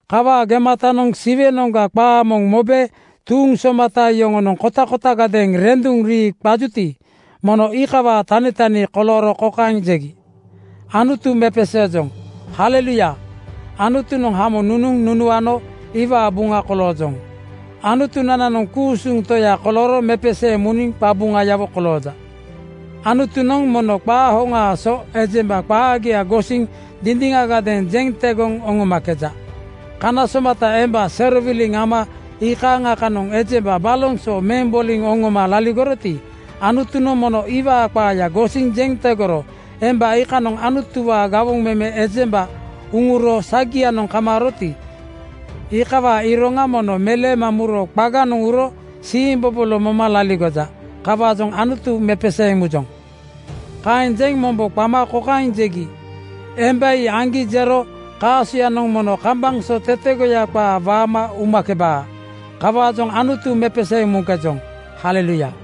Kawaa gematanoŋ Siwenoŋga qaa moŋ mobe tuuŋ somata yoŋonoŋ kotakotagadeeŋ renduŋ rii qajuti, mono iikawaa tanitani kolooro kokaeŋ jegi, “Anutu mepeseejoŋ haleluya! Anutunoŋ hamo nunuŋ nunuano iwaa buŋa koloojoŋ. Anutunananoŋ ku-usuŋ Toya kolooro mepeseeŋ muniŋ qabuŋayawo kolooja. Anutunoŋ mono qaa hoŋaa so ejemba qaagia gosiŋ dindiŋagadeeŋ jeŋ tegoŋ nonomakeja. Kana somata emba serowiliŋ ama iikaaŋa kanoŋ ejemba baloŋ so meŋ boliŋ oŋoma laligoroti, Anutunoŋ mono iwaa qaaya gosiŋ jeŋ tegoro. Emba iikanoŋ Anutuwaa gawoŋ meme ejemba uŋuro sagianoŋ kamaaroti, iikawaa iroŋa mono meleema muro qaganoŋ uro siimbobolo moma laligoja. Kawaajoŋ Anutu mepeseeŋ mujoŋ.” Kaeŋ jeŋ mombo qama kokaeŋ jegi, “Emba ii aŋgi jero kaasoyanoŋ mono kambaŋ so tetegoya qaa waama umakebaa. Kawaajoŋ Anutu mepeseeŋ muŋkejoŋ, haleluya!”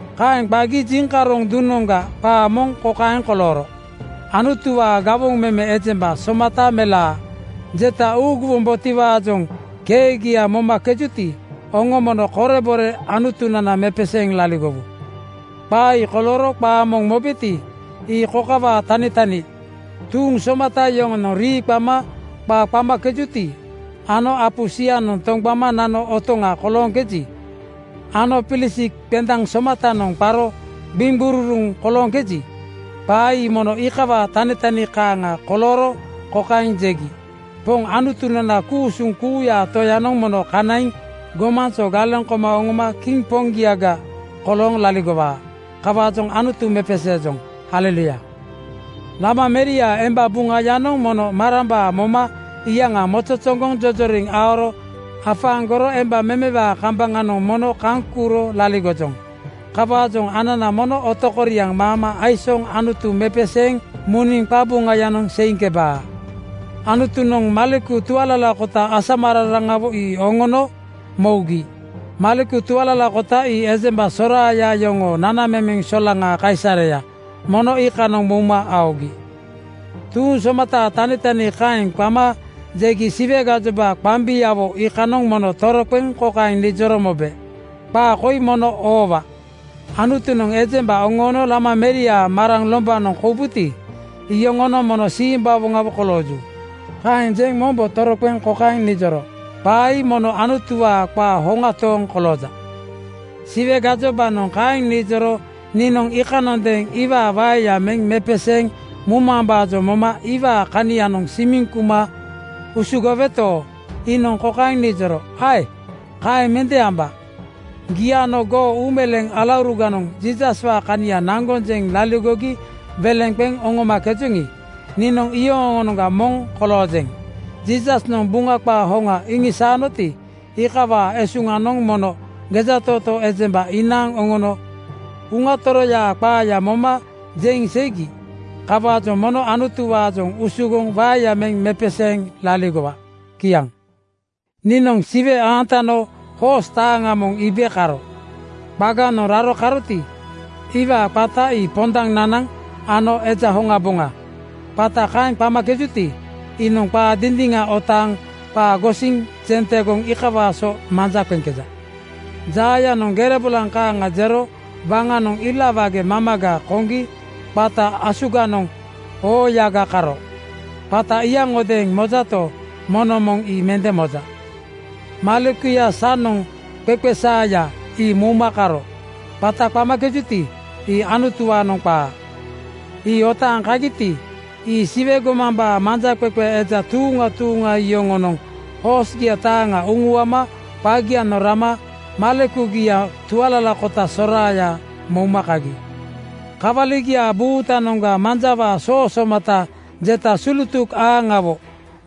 Kaeŋ qagi jiŋkaroŋ duŋnoŋga qaa moŋ kokaeŋ kolooro, “Anutuwaa gawoŋ meme ejemba somata melaa jeta uuguwombotiwaajoŋ keegia momakejuti, oŋo mono korebore Anutunana mepeseeŋ laligowu.” Qaa ii kolooro qaa moŋ mobeti, ii kokawaa tanitani: Tuuŋ somata yoŋonoŋ rii qama qa qamakejuti ano apu sianoŋ toŋgbama nano otoŋa kolooŋkeji ano pilisik qendaŋ somatanoŋ qaro gbiŋgururuŋ kolooŋkeji, qaa ii mono iikawaa tanitani kaaŋa kolooro kokaeŋ jegi, “Poŋ Anutunana, ku-usuŋ kuuyaa Toyanoŋ mono kanaiŋ gomaŋ so galeŋ koma oŋoma kiŋ Poŋgiaga kolooŋ laligowaa. Kawaajoŋ Anutu mepeseejoŋ, haleluya! Lama meriaa emba buŋayanoŋ mono marambaa moma iyaŋa mozozoŋgoŋ jojoriŋ aoro afaaŋgoro emba memewaa kambaŋanoŋ mono kaŋ kuuro laligojoŋ. Kawaajoŋ anana mono otokoriaŋ maama aisooŋ Anutu mepeseeŋ muniŋ qabuŋayanoŋ seiŋkebaa. Anutunoŋ maleku tualalakota asamararaŋawo ii oŋono mougi.” (Maleku tualalakota ii ejemba soraaya yoŋoo nanamemeŋ solaŋaa kaisareya, mono iikanoŋ mouma aogi.) Tuuŋ somataa tanitani kaeŋ qama jegi Siwe gajoba qambiawo iikanoŋ mono toroqeŋ kokaeŋ nijoro mobe, “Qaa koi mono oowa: Anutunoŋ ejemba oŋoono Lama meriaa maraŋ (emba memewaa) lombanoŋ koubuti, iyoŋonoŋ mono simbawoŋawo kolooju.” Kaeŋ jeŋ mombo toroqeŋ kokaeŋ nijoro, “Qaa ii mono Anutuwaa qaa hoŋa tooŋ kolooja.” Siwe gajobanoŋ kaeŋ nijoro niinoŋ iikanondeeŋ iwaa waeya meŋ mepeseeŋ mumambaajoŋ moma iwaa kanianoŋ simiŋ kuma usugoweto, iinoŋ kokaeŋ nijoro, “Ae! Kaeŋ mende amba. Gii ano goo uumeleeŋ alauruganoŋ Jiisaswaa kania naŋgoŋ jeŋ laligogi weleŋ qeŋ oŋomakejoŋi, niinoŋ iyoŋoonoŋga moŋ koloojeŋ. Jiisasnoŋ Buŋa qaa hoŋa iŋisaanoti, iikawaa esuŋanoŋ mono gejatootoo ejemba inaaŋ oŋono Uŋa Toroyaa qaaya moma jeŋ seigi. Kawaajoŋ mono Anutuwaajoŋ usugoŋ waeya meŋ mepeseeŋ laligowa.” Kiaŋ. Niinoŋ Siwe aantano hoos taaŋa moŋ iibe karo. Qaganoŋ raro karoti, iwaa qata ii Pondaŋ Nanaŋ (Kawali) ano Eja Hoŋaboŋa. Qata kaeŋ qamakejuti, iinoŋ qaa dindiŋa otaaŋ qaa gosiŋ jeŋ tegoŋ iikawaa so manja qeŋkeja. Jaayanoŋ gere bolaŋ kaaŋa jero waŋanoŋ ila wage mamaga koŋgi qata asuganoŋ oo-ooyaga karo. Qata iyaŋodeeŋ mojato, moŋnoŋ moŋ ii mende moja. Malekuya sanoŋ qeeqeesaaya ii mouma karo. Qata qamakejuti, ii Anutuwaanoŋ qaa. Ii otaaŋ kagiti, ii Siwe gomambaa manjaqeqe eja tuuŋa tuuŋa. Yoŋonoŋ hoosgia taaŋa uŋuama qagianoŋ rama malekugia tualalakota soraaya mouma kagi. Kawaligiaa buutanoŋga manjawaa soo somata (bainat) jeta sulutuk aaŋawo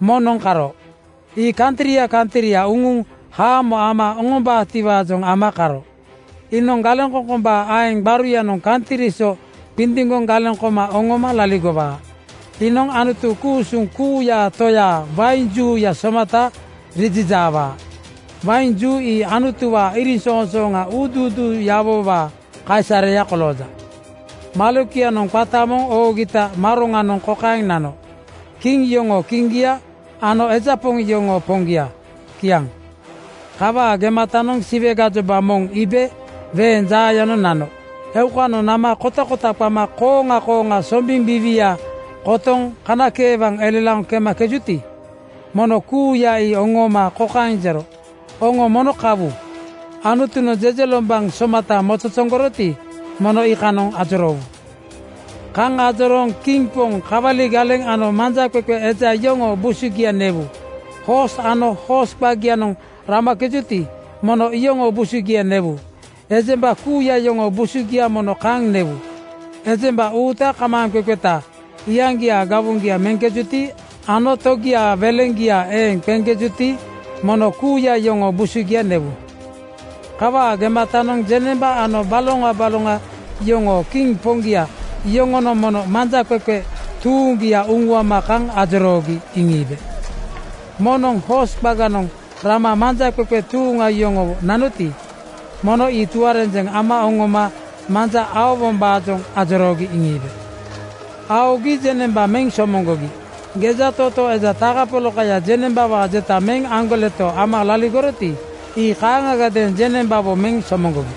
moŋnoŋ karo. Ii kantria kantria uŋuŋ haamo ama oŋombaatiwaajoŋ ama karo. Iinoŋ galeŋkoŋkombaa aeŋ gbaruyanoŋ kantri so qindiŋgoŋ galeŋ koma oŋoma laligowaa. Iinoŋ Anutu ku-usuŋ kuuyaa Toyaa wain juuya somata rijijaawaa. Wain juu ii Anutuwaa iriŋsoŋsooŋa uuduuduuyawowaa kaisareya kolooja. Malekuyanoŋ qata moŋ oogita maroŋanoŋ kokaeŋ nano, “Kiŋ yoŋoo Kiŋgia ano eja poŋ yoŋoo Poŋgia.” Kiaŋ. Kawaa gematanoŋ Siwe gajoba moŋ iibe weeŋ jaayanoŋ nano. Eukanoŋ nama kotakota qama kooŋa kooŋa sombiŋ biiwia kotoŋ kanakeewaŋ elelaoŋ kemakejuti, mono kuuya ii oŋooma kokaeŋ jero, “Oŋo mono kawu-u! Anutunoŋ jejelombaŋ somata mozozoŋgoroti, mono iikanoŋ ajoroowu. Kaŋ ajorooŋ kiŋ poŋ, kawali galeŋ ano manjaqeqe eja yoŋoo busugia newu. Hoos ano hoos qagianoŋ ramakejuti, mono iyoŋoo busugia newu. Ejemba kuuya yoŋoo busugia mono kaŋ newu. Ejemba uuta kamaaŋqeqeta, iyaŋgiaa gawoŋgia meŋkejuti ano togiaa weleŋgia eeŋ qeŋkejuti, mono kuuya iyoŋoo busugia newu.” Kawaa gematanoŋ jeŋnemba ano baloŋa baloŋa yoŋoo kiŋ poŋgia iyoŋonoŋ mono manjaqeqe tuuŋgia uŋuama kaŋ ajoroogi iŋiibe. Moŋnoŋ hoos qaganoŋ rama manjaqeqe tuuŋa yoŋowo nanoti, mono ii tuarenjeŋ ama oŋoma manja aowombaajoŋ ajoroogi iŋiibe. Aogi jeŋnemba meŋ somoŋgogi. Gejatootoo eja takapolakaya jeŋnembawaa jeta meŋ aŋgoleto ama laligoroti, ii kaaŋagadeeŋ jeŋnembawo meŋ somoŋgogi.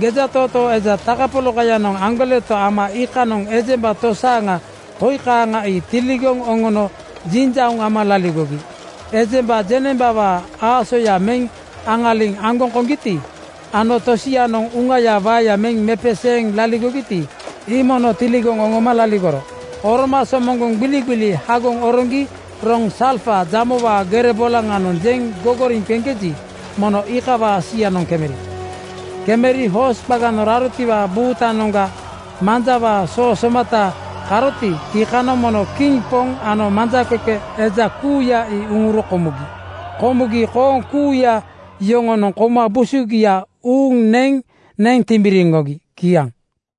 Gejatootoo eja takapolakayanoŋ aŋgoleto ama iikanoŋ ejemba tosaaŋa koi kaaŋa ii tiligoŋ oŋono jinjauŋ ama laligogi: Ejemba jeŋnembawaa aasoya meŋ aŋaliŋ aŋgoŋ koŋgiti ano tosianoŋ uŋayaa waeya meŋ mepeseeŋ laligogiti, ii mono tiligoŋ oŋoma laligoro. Oroma somoŋgoŋ gbiligbili hagoŋ oroŋgi roŋ salfa jamowaa gere bolaŋanoŋ jeŋ gogoriŋ qeŋkeji, mono iikawaa sianoŋ kemeri. Kemeri hoos qaganoŋ rarotiwaa buutanoŋga manjawaa soo somata (bainat) karoti, iikanoŋ mono kiŋ poŋ ano manjaqeqe eja kuuya ii uŋuro komugi. Komugi kooŋ kuuya yoŋonoŋ kouma busugia uuŋ neŋ neŋ timbiriŋgogi. Kiaŋ.